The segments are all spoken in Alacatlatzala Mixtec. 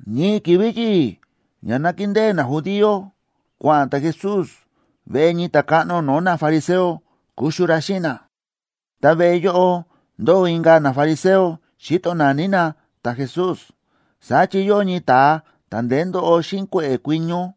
Ñii ki̱vi̱ yi̱i̱ ña nákindée najudío, kua̱ꞌa̱n ta̱Jesús veꞌe ñii ta̱káꞌno no̱o̱ nafariseo kuxu ra xíꞌin na. Ta veꞌe yóꞌo ndóo inka̱ nafariseo, xíto naní na ta̱Jesús. Saá chi yóo ñii ta̱a ta̱ ndeé ndóꞌo xíꞌin kue̱ꞌe̱ kuiño.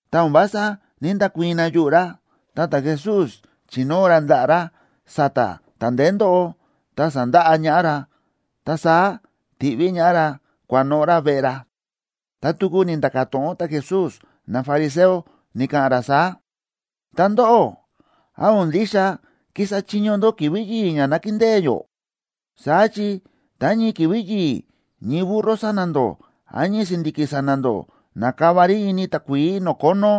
Ta o̱n vása ní‑ndakuii̱n na yuꞌu̱ ra. Ta ta̱Jesús, chi̱nóo ra ndaꞌa̱ ra sa̱ta̱ ta̱ ndeé ndóꞌo, ta sa̱ndaꞌa ñaꞌá ra. Ta saá ti̱ꞌví ñaꞌá ra kua̱noꞌo̱ ra veꞌe ra. Ta tuku ni̱nda̱ka̱ to̱ꞌon ta̱Jesús nafariseo, ni̱ka̱ꞌa̱n ra saá: ―Ta ndóꞌó, ¿án o̱n ndixa kísa chiño ndó ki̱vi̱ yi̱i̱ ña nákindée yó? Saá chi tá ñii ki̱vi̱ yi̱i̱ ñii burro sa̱na̱ ndó, án ñii si̱ndi̱ki̱ sa̱na̱ ndó nakava rí ini takuií no̱o̱ kónó,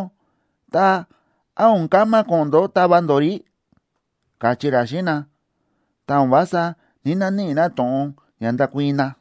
ta, ¿án o̱n kama ko̱ꞌo̱n ndó tava ndó rí? ―káchí ra xíꞌin na. Ta o̱n vása ní‑naníꞌi na to̱ꞌon ña ndakuii̱n na.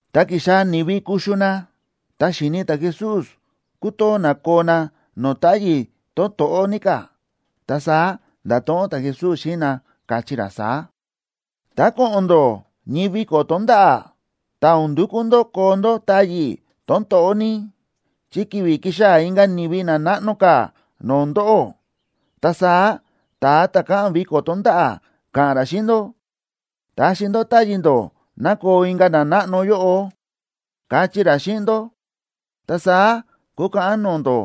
Tá ki̱xaa̱ ni̱vi kuxu na, ta xi̱ni̱ ta̱Jesús kútoo na koo na no̱o̱ táyi̱ tón to̱ꞌó ní ka̱. Ta saá nda̱to̱ꞌon ta̱Jesús xíꞌin na, káchí ra saá: ―Tá ko̱ꞌo̱n ndó ñii viko̱ tonda̱ꞌa̱, ta o̱n ndukú ndó koo ndó táyi̱ tón to̱ꞌó ní, chi kivi kixaa̱ inka̱ ni̱vi na náꞌno ka̱ no̱o̱ ndóꞌó. Ta saá ta̱a ta̱ káꞌa̱n viko̱ tonda̱ꞌa̱ ka̱ꞌa̱n ra xíꞌin ndó: “Taxi ndó táyi̱ ndó ná koo inka̱ nanáꞌno yóꞌo”, kachí ra xíꞌin ndó. Ta saá kukaꞌan no̱o̱ ndó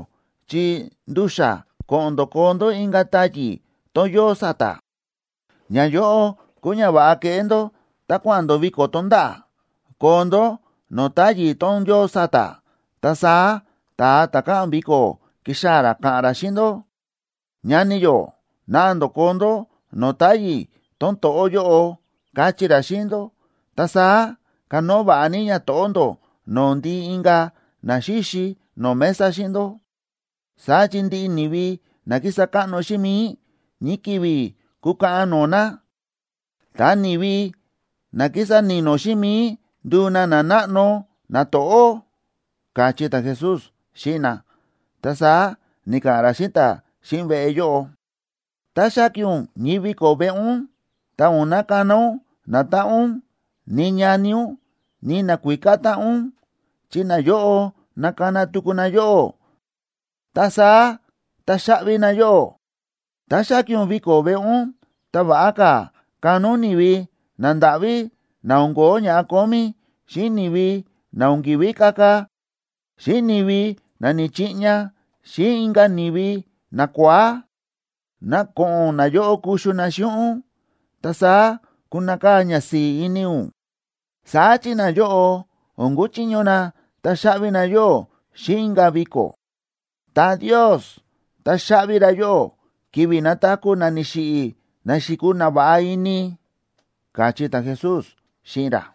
chi ndu̱xa̱ ko̱ꞌo̱n ndó koo ndó inka̱ táyi̱ tón yóo sa̱ta̱. Ñayóꞌo kúu ñava̱ꞌa keꞌé ndó tá kua̱ꞌa̱n ndó viko̱ tonda̱ꞌa̱: koo ndó no̱o̱ táyi̱ tón yóo sa̱ta̱. Ta saá ta̱a ta̱ káꞌa̱n viko̱ kixaa̱ ra ka̱ꞌa̱n ra xíꞌin ndó: “Ñani yó, naꞌa ndó koo ndó no̱o̱ táyi̱ tón to̱ꞌó yóꞌo”, kachí ra xíꞌin ndó. Ta saá kanóo va̱ꞌa ní ñato̱ꞌó ndó no̱o̱ ndiꞌi inka̱ na xíxi no̱o̱ mesa xíꞌin ndó. Saá chi ndiꞌi ni̱vi na kísa káꞌno xíꞌin mi̱i, ñii ki̱vi̱ kukaꞌan no̱o̱ na. Ta ni̱vi na kísa ni̱no̱ xíꞌin mi̱i nduu na nanáꞌno nato̱ꞌó ―káchí ta̱Jesús xíꞌin na. Ta saá ni̱ka̱ꞌa̱n ra xíꞌin ta̱ xíꞌin veꞌe yóꞌo: ―Tá xáki̱n ún ñii viko̱ veꞌe ún, ta o̱n nakana ún natáꞌan ún, ni ñani ún, ni nakuíká táꞌan ún, chi nayóꞌo nakana tuku na yóꞌó, ta saá taxaꞌvi na yóꞌó. Tá xáki̱n ún viko̱ veꞌe ún, ta va̱ꞌa ka̱ kana ún ni̱vi nandáꞌví, na o̱n ko̱ó ña kómí, xíꞌin ni̱vi na o̱n ki̱ví kaka, xíꞌin ni̱vi na ni̱chiꞌña, xíꞌin inka̱ ni̱vi nakua̱á. Ná ko̱ꞌo̱n nayóꞌo kuxu na xíꞌin ún, ta saá kunakaa̱ ñasi̱i̱ ini ún. Saá chi nayóꞌo o̱n kuchiño na taxaꞌvi na yóꞌó xíꞌin inka̱ viko̱. Ta Ndios taxaꞌvi ra yóꞌó ki̱vi̱ nataku̱ na ni̱xiꞌi̱ na xi̱kuu na va̱ꞌa ini ―káchí ta̱Jesús xíꞌin ra.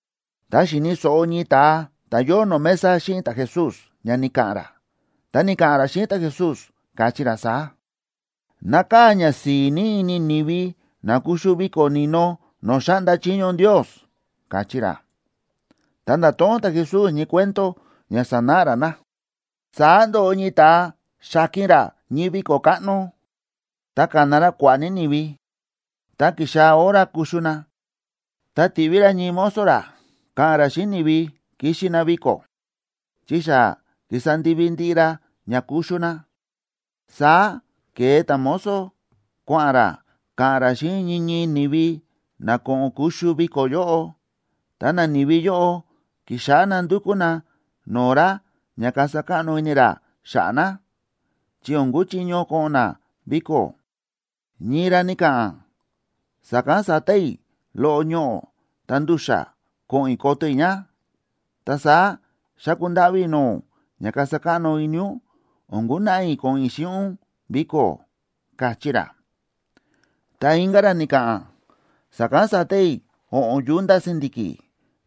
Tá xi̱ni̱ so̱ꞌo ñii ta̱a ta̱ yóo no̱o̱ mesa xíꞌin ta̱Jesús ña ni̱ka̱ꞌa̱n ra, ta ni̱ka̱ꞌa̱n ra xíꞌin ta̱Jesús, káchí ra saá: ―¡Nákaa̱ ñasi̱i̱ ní ini ni̱vi na kuxu viko̱ ni̱no no̱o̱ xáꞌnda chiño Ndios! ―káchí ra. Ta nda̱to̱ꞌon ta̱Jesús ñii cuento ña sanáꞌa ra na: ―Saá ndo̱ꞌo ñii ta̱a xa̱ki̱n ra ñii viko̱ káꞌno, ta ka̱na ra kua̱ꞌa̱ ní ni̱vi. Tá ki̱xaa̱ hora kuxu na, ta ti̱ꞌví ra ñii mozo ra ka̱ꞌa̱n ra xíꞌin ni̱vi kixi na viko̱, chi xa ki̱sa ndivi ndiꞌi ra ña kuxu na. Saá ke̱e ta̱mozo, kua̱ꞌa̱n ra ka̱ꞌa̱n ra xíꞌin ñii ñii ni̱vi ná ko̱ꞌo̱n kuxu viko̱ yóꞌo. Ta nani̱vi yóꞌo ki̱xáꞌá na ndúkú na no̱o̱ ra ña kasa káꞌno ini ra xa̱ꞌa̱ na, chi o̱n kúchiño ko̱ꞌo̱n na viko̱. Ñii ra ni̱ka̱ꞌa̱n: “Sa̱kán sa̱ta i̱ loꞌo ñoꞌo̱ ta ndu̱xa̱ ko̱ꞌo̱n i̱ koto i̱ ña. Ta saá xáku ndáꞌví i̱ no̱o̱ ún ña kasa káꞌno ini ún, o̱n kunaꞌa i̱ ko̱ꞌo̱n i̱ xíꞌin ún viko̱”, káchí ra. Ta inka̱ ra ni̱ka̱ꞌa̱n: “Sa̱kán sa̱ta i̱ o̱ꞌo̱n yunta si̱ndi̱ki̱,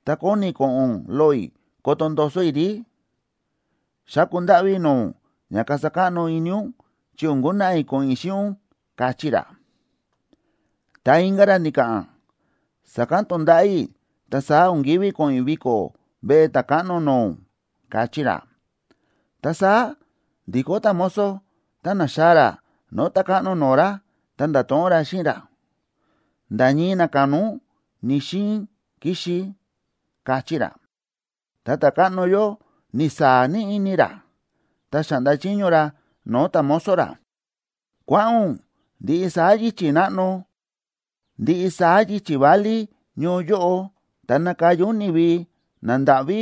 ta kóni ko̱ꞌo̱n loꞌo i̱ koto ndoso i̱ rí. Xáku ndáꞌví i̱ no̱o̱ ún ña kasa káꞌno ini ún, chi o̱n kunaꞌa i̱ ko̱ꞌo̱n i̱ xíꞌin ún”, káchí ra. Ta inka̱ ra ni̱ka̱ꞌa̱n: “Sa̱kán to̱nda̱ꞌa̱ i̱, ta saá o̱n ki̱ví ko̱ꞌo̱n i̱ viko̱ veꞌe ta̱káꞌno no̱o̱ ún”, káchí ra. Ta saá ndi̱kó ta̱mozo, ta na̱xaa̱ ra no̱o̱ ta̱káꞌno no̱o̱ ra, ta nda̱to̱ꞌon ra xíꞌin ra: “Nda̱ ñii na ka̱na ún ni̱‑xiin kixi”, káchí ra. Ta ta̱káꞌno yóꞌo ni̱saa̱ ní ini ra, ta xa̱ꞌnda chiño ra no̱o̱ ta̱mozo ra: “Kua̱ꞌa̱n ún ndiꞌi saá yichi̱ náꞌno, ndiꞌi saá yichi̱ válí ñoo yóꞌo, ta nakaya ún ni̱vi nandáꞌví,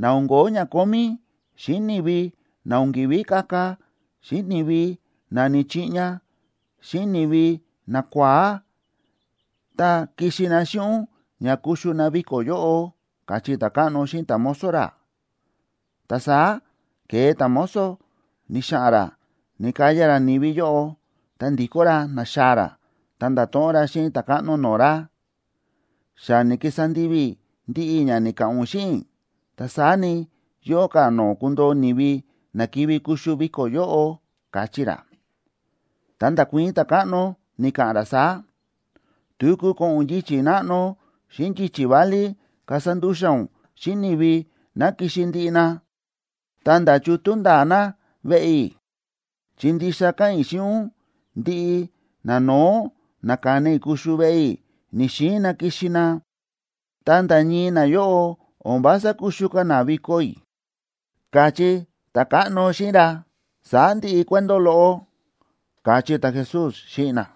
na o̱n ko̱ó ña kómí, xíꞌin ni̱vi na o̱n ki̱ví kaka, xíꞌin ni̱vi na ni̱chiꞌña, xíꞌin ni̱vi nakua̱á, ta kixi na xíꞌin ún ña kuxu na viko̱ yóꞌo”, káchí ta̱káꞌno xíꞌin ta̱mozo ra. Ta saá ke̱e ta̱mozo ni̱xa̱ꞌa̱n ra na̱kaya ra ni̱vi yóꞌo. Tá ndi̱kó ra na̱xaa̱ ra, ta nda̱to̱ꞌon ra xíꞌin ta̱káꞌno no̱o̱ ra: “Xa ni̱kisa ndivi i̱ ndiꞌi ña ni̱ka̱ꞌa̱n ún xíꞌin i̱, ta saá ni, yóo ka̱ no̱o̱ kundoo ni̱vi na kivi kuxu viko̱ yóꞌo”, káchí ra. Ta nda̱kuii̱n ta̱káꞌno, ni̱ka̱ꞌa̱n ra saá: “Tuku ko̱ꞌo̱n ún yichi̱ náꞌno xíꞌin yichi̱ válí kasa ndu̱xa̱ ún xíꞌin ni̱vi ná kixi ndiꞌi na, ta̱nda̱ chútú nda̱a̱ na veꞌe i̱. Chi ndixa káꞌa̱n i̱ xíꞌin ún, ndiꞌi nano̱ó na ka̱na i̱ kuxu veꞌe i̱, ni̱‑xiin na kixi na. Ta nda̱ ñii nayóꞌo o̱n vása kuxu ka̱ na viko̱ i̱”, káchí ta̱káꞌno xíꞌin ra. Saá ndi̱ꞌi cuento loꞌo ―káchí ta̱Jesús xíꞌin na.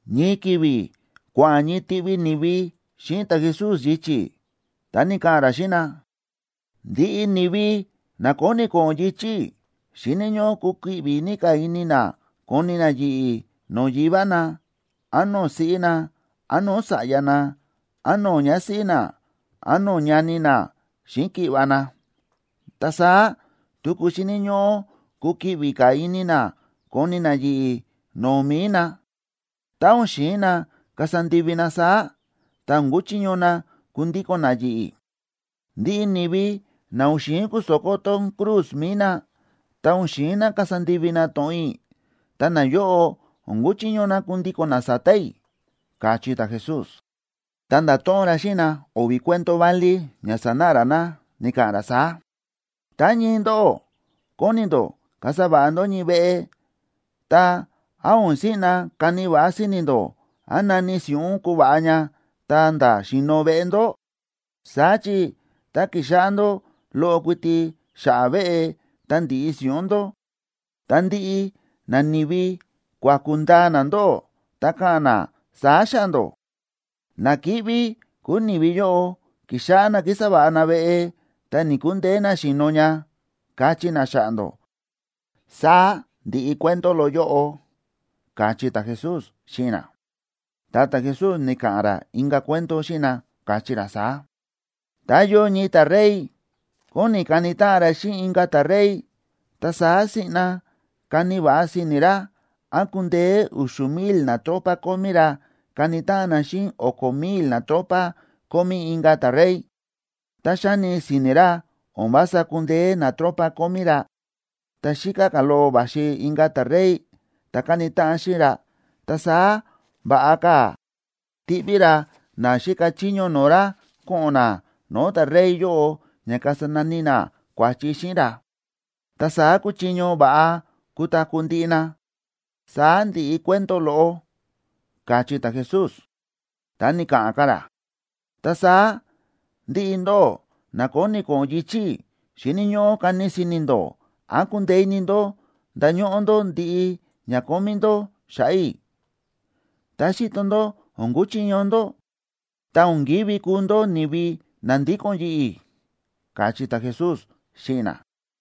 Ñii ki̱vi̱ kua̱ꞌa̱n ñii tiꞌvi ni̱vi xíꞌin ta̱Jesús yichi̱, ta ni̱ka̱ꞌa̱n ra xíꞌin na: ―Ndiꞌi ni̱vi na kóni ko̱ꞌo̱n yichi̱ i̱ xíni̱ ñóꞌó kukiꞌvi ní ka̱ ini na koni na yi̱ꞌi̱ no̱o̱ yivá na, án no̱o̱ siꞌí na, án no̱o̱ sa̱ꞌya na, án no̱o̱ ñásíꞌí na, án no̱o̱ ñani na xíꞌin ki̱ꞌva̱ na. Ta saá tuku xíni̱ ñóꞌó kukiꞌvi ka̱ ini na koni na yi̱ꞌi̱ no̱o̱ mi̱i na. Tá o̱n xi̱in na kasa ndivi na saá, ta o̱n kuchiño na kundíko̱n na yi̱ꞌi̱. Ndiꞌi ni̱vi na o̱n xi̱in kuso̱kó tón cruz mi̱i na,a ta o̱n xi̱in na kasa ndivi na to̱ꞌon i̱, ta nayóꞌo o̱n kúchiño na kundíko̱n na sa̱ta̱ i̱ ―káchí ta̱Jesús. Ta nda̱to̱ꞌon ra xíꞌin na o̱vi̱ cuento válí ña sanáꞌa ra na, ni̱ka̱ꞌa̱n ra saá: ―Tá ñii ndóꞌó kóni ndó kasa va̱ꞌa ndó ñii veꞌe, ta, ¿án o̱n siꞌna kani va̱ꞌa si̱ni̱ ndó án nani si̱ꞌún kuva̱ꞌa ña ta̱nda̱ xi̱no̱ veꞌe ndó? Saá chi tá kixáꞌá ndó loꞌo kuiti xa̱ꞌa̱ veꞌe, ta ndi̱ꞌi si̱ꞌún ndó, ta ndiꞌi nani̱vi kuaku̱ ndaa na ndóꞌó, ta ka̱ꞌa̱n na saá xa̱ꞌa̱ ndó: “Na kíꞌví kúu ni̱vi yóꞌo, ki̱xáꞌá na kísa va̱ꞌa na veꞌe, ta ni̱‑kundeé na xi̱no̱ ña”, kachí na xa̱ꞌa̱ ndó. Saá ndi̱ꞌi cuento loꞌo yóꞌo ―káchí ta̱Jesús xíꞌin na. Ta ta̱Jesús ni̱ka̱ꞌa̱n ra inka̱ cuento xíꞌin na, káchí ra saá: ―Tá yóo ñii ta̱rey kóni kani táꞌan ra xíꞌin inka̱ ta̱rey, ta saá siꞌna kani va̱ꞌa si̱ni̱ ra án kundeé u̱xu̱ mil natropa kómí ra kani táꞌan na xíꞌin o̱ko̱ mil natropa kómí inka̱ ta̱rey. Tá xáni si̱ni̱ ra o̱n vása kúndeé natropa kómí ra, tá xíká ka̱ loꞌo va̱xi inka̱ ta̱rey ta̱ kani táꞌan xíꞌin ra, ta saá va̱ꞌa ka̱ tiꞌví ra na xíka chiño no̱o̱ ra ko̱ꞌo̱n na no̱o̱ ta̱rey yóꞌo ña kasa nani na kua̱chi xíꞌin ra. Ta saá kuchiño va̱ꞌa kutaku̱ ndiꞌi na. Saá ndi̱ꞌi cuento loꞌo ―káchí ta̱Jesús. Ta ni̱ka̱ꞌa̱n ka̱ ra: ―Ta saá ndiꞌi ndóꞌó na kóni ko̱ꞌo̱n yichi̱ i̱, xíni̱ ñóꞌó kani si̱ni̱ ndó án kundeé ini ndó ndañóꞌó ndó ndiꞌi ña kómí ndó xa̱ꞌa̱ i̱. Tá xíto ndó o̱n kuchiño ndó, ta o̱n kívi kuu ndó ni̱vi na ndíko̱n yi̱ꞌi̱ ―káchí ta̱Jesús xíꞌin na.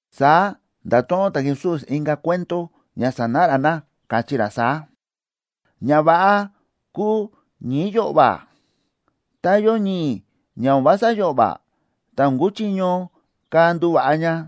Saá nda̱to̱ꞌon ta̱Jesús inka̱ cuento ña sanáꞌa ra na, káchí ra saá: ―Ña va̱ꞌa kúu ñi̱i̱ yo̱ꞌva̱. Tá yóo ñi̱i̱ ña o̱n vása yo̱ꞌva̱, ta o̱n kuchiño ka̱ nduva̱ꞌa ña.